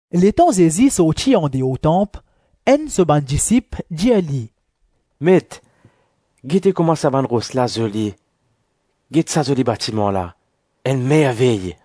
Letan Zezi sorti andeor tanp, enn so bann disip dir li, “Met, gete kouma sa bann ros la zoli, get sa zoli batiman la, enn mervey!”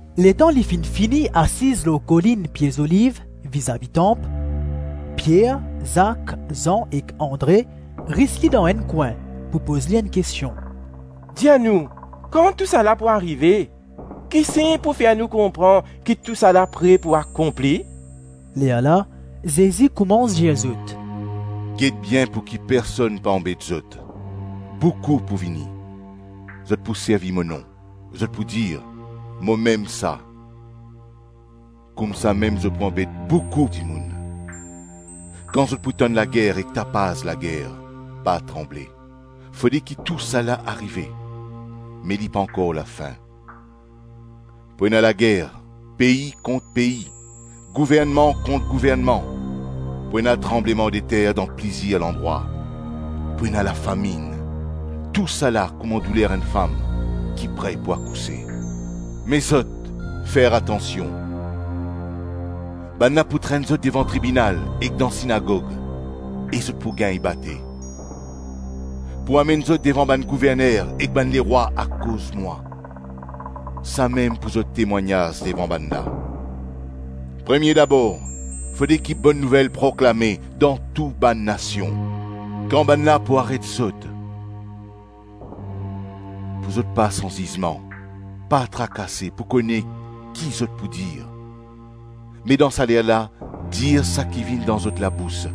Letan li finn fini asiz lor Kolinn Pie Zoliv, vizavi tanp, Pier, Zak, Zan ek Andre ris li dan enn kwin pou poz li enn kestion, “Dir nou, kan tousala pou arive? Ki sign pou fer nou konpran ki tousala pre pou akonpli?” Lerla Zezi koumans dir zot, “Get bien pouki personn pa anbet zot; Boukou pou vini, zot pou servi mo nom, zot pou dir ‘Momem sa.’ Koumsamem zot pou anbet boukou dimoun. Kan zot pou tann lager ek tapaz lager, pa tranble; fode ki tousala arive, me li pankor lafin. Pou ena lager, pei kont pei, gouvernman kont gouvernman, pou ena tranblemandeter dan plizir landrwa, pou ena lafaminn; tousala kouma douler enn fam ki pre pou akouse. Me zot, fer atansion; bannla pou trenn zot devan tribinal ek dan sinagog e zot pou gagn bate; pou amenn zot devan bann gouverner ek bann lerwa akoz mwa, samem pou zot temwagnaz devan bannla. Premie dabor, fode ki Bonn Nouvel proklame dan tou bann nasion. Kan bannla pou aret zot, pou zot pas anzizman, pa trakase pou kone ki zot pou dir; me dan salerla dir saki vinn dan zot labous;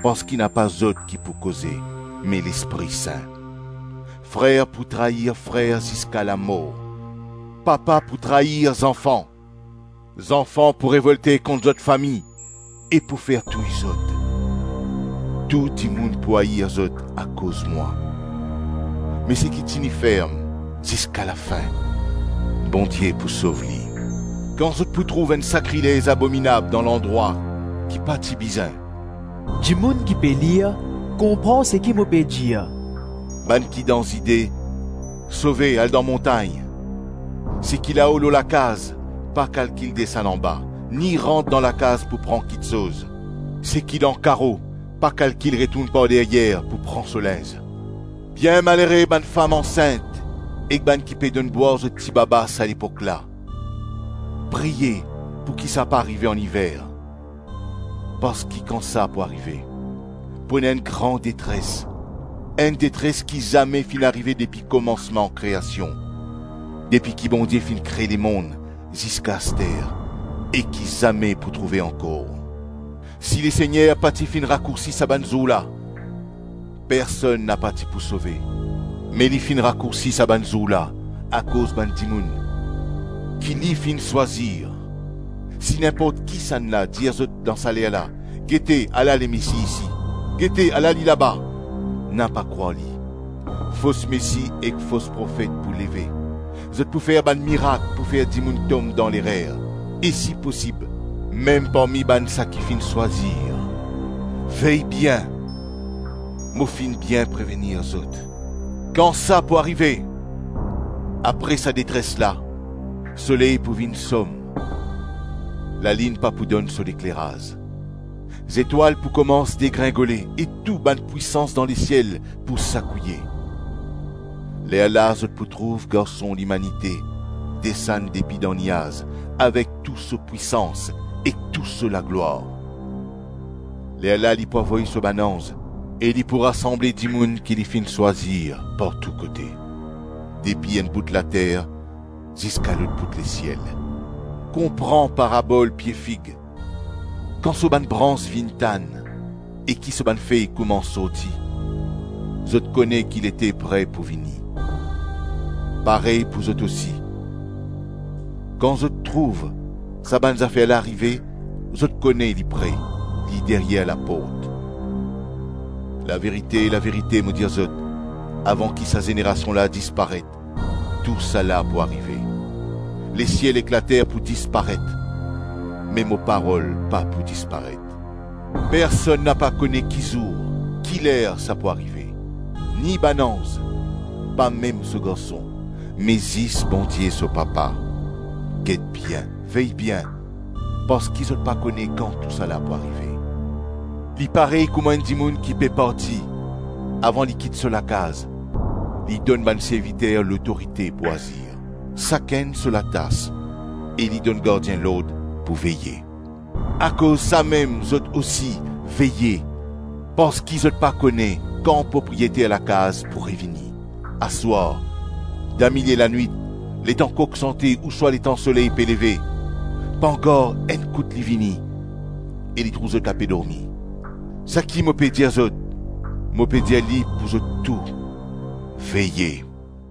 parski napa zot ki pou koze me Lespri Sin. Frer pou trair frer ziska lamor, papa pou trair zanfan; zanfan pou revolte kont zot fami e pou fer touy zot. Tou dimoun pou air zot akoz mwa; me seki tini ferm ziska lafin, Bondie pou sov li. Kan zot pou trouv enn sakrilez abominab dan landrwa ki pa ti bizin (dimoun ki pe lir, konpran seki mo pe dir), bann ki dan Zide, sove, al dan montagn. Seki lao lor so lakaz, pa kalkil desann anba, ni rant dan lakaz pou pran kiksoz; seki dan karo, pa kalkil retourn par deryer pou pran so linz. Bien malere bann fam ansint ek bann ki pe donn bwar zot tibaba sa lepok la. Priye pouki sa pa arive an-iver. Parski kan sa pou arive, pou ena enn gran detres, enn detres ki zame finn arive depi komansman kreasion, depi ki Bondie finn kre lemonn ziska aster, e ki zame pou trouve ankor. Si Lesegner pa ti finn rakoursi sa bann zour la, personn napa ti pou sove; me li finn rakoursi sa bann zour la, akoz bann dimoun ki li finn swazir. Si ninport kisannla dir zot dan salerla, ‘Gete, ala Lemesi isi! Gete ala li laba!’ Napa krwar li. Fos mesi ek fos profet pou leve; zot pou fer bann mirak pou fer dimoun tom dan lerer, e si posib, mem parmi bann saki finn swazir. Vey bien; mo finn bien prevenir zot. Kan sa pou arive, apre sa detres la, soley pou vinn som, lalinn pa pou donn so lekleraz, zetwal pou koumans degringole e tou bann pwisans dan lesiel pou sakouye. Lerla zot pou trouv Garson Limanite desann depi dan niaz avek tou so pwisans ek tou so laglwar. Lerla li pou avoy so bann anz e li pou rasanble dimoun ki li finn swazir partou kote, depi enn bout later ziska lot bout lesiel. Konpran parabol pie fig: kan so bann brans vinn tann e ki so bann fey koumans sorti, zot kone ki lete pre pou vini. Parey pou zot osi, kan zot trouv sa bann zafer la arive; zot kone li pre, li deryer laport. Laverite, laverite mo dir zot, avan ki sa zenerasion la disparet, tousala pou arive. Lesiel ek later pou disparet me mo parol pa pou disparet. Personn napa kone ki zour, ki ler sa pou arive, ni bann anz, pa mem so Garson, me zis Bondie so Papa. Get bien, vey bien; parski zot pa kone kan tousala pou arive. Li parey kouma enn dimoun ki pe parti; avan li kit so lakaz, li donn bann serviter lotorite pou azir, sakenn so latas e li donn gardien lord pou veye. Akoz samem zot ousi, veye, parski zot pa kone kan propriyeter lakaz pou revini: aswar, damilie lanwit, letan kok sante, ouswa letan soley pe leve, pangar, enn kout li vini e li trouv zot ape dormi. Saki mo pe dir zot, mo pe dir li pou zot tou: Veye.”